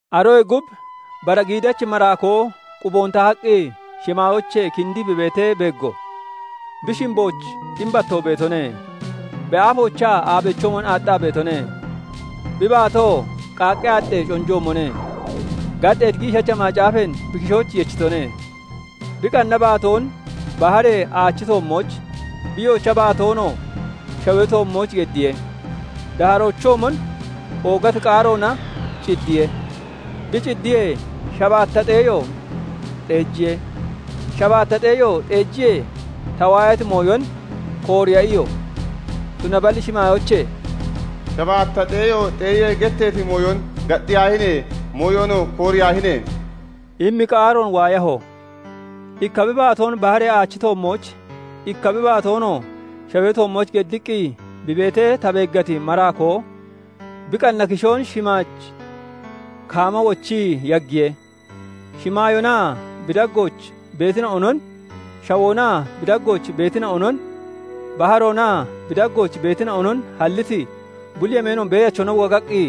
Aroyee gub bara giidachi maraakoo quboon tahaqqi, shimaayoochee kindii bi beetee beeggo; bi shimbooch ximbatoo beetone; bi aafoochaa aabeechoomon aaxxaa beetone; bi baatoo qaaqqee aaxxee conjoomone. Gaxxeeti giishacha macaafeen bi kishooch yechitone; bi qanna baatoon baharee aachi toommooch, bi yoocha baatoonoo shawee toommooch geddiye. Daaharoochoomon oogati qaaroona ciddiye; bi ciddiyee, shabaatta xeeyo xeejiye. Shabaatta xeeyo xeejiyee, ta waayati mooyon kooriya iyo; tunaballi shimaayoochee "Shabaatta xeeyo xeeyee getteeti mooyon gaxxiyaahine! Mooyonoo kooriyaahine!" immi qaaroon waayaho. Ikka bi baatoon baharee aachi toommooch, ikka bi baatoonoo shawee toommooch geddiqqi bi beetee ta beeggati maraakoo bi qanna kishoon shimaaj kaama wochii yaggiye; Shimaayoonaa bi daggooch beetina'onon, shawoonaa bi daggooch beetina'onon, baharoonaa bi daggooch beetina'onon halliti, bulli yemeenoon Beeyachona wogaqqi,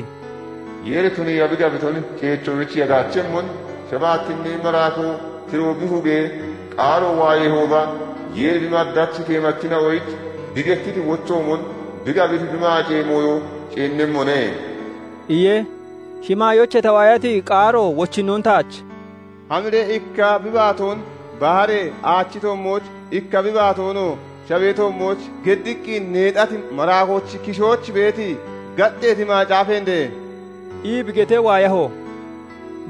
"Yeeri tuniiya bi gabiton ceechoyich yagaachemmon; shabaatinnee maraakoo tiroon bi hugee qaaro waayeehooba, Yeeri bi maddachi keemachina'oyich bi gettiti wochoomon, bi gabiti bi maacee mooyo ceennemmone" iye. Shimaayoochee ta waayati qaaro wochinnoon taach "Hamiree ikka bi baatoon baharee aachi toommooch, ikka bi baatoonoo shawee toommooch geddiqqi neexati maraakoochi kishooch beeti gaxxeeti macaafeen dee!" ii bi getee waayaho.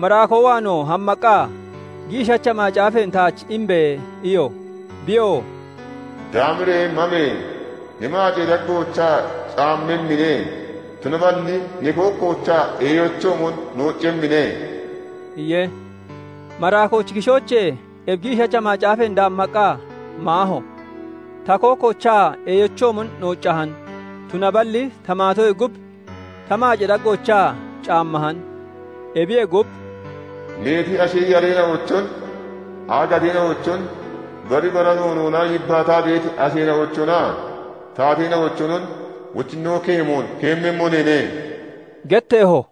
Maraakoo waanoo hammaqqa, "Giishacha macaafeen taach imbe!" iyo. Biyoo "Daamiree mame! Ne maacee daggoochaa caammemmine; tunaballi ne kookkoochaa eeyochoomon nooccemmine" iye. Maraakoochi kishoochee ebi giishacha macaafeen daammaqqa maaho; ta kookkoochaa eeyochoomon nooccahan; tunaballi ta maatoyee gub ta maacee daggoochaa caammahan. Ebiyee gub, "Meeti ashi yareena'ochon, aagateena'ochon, bari bara noonoona yibbaataa beeti asheena'ochonaa taateena'ochonon wochinnoon keemoon keemmemmo neene" getteeho.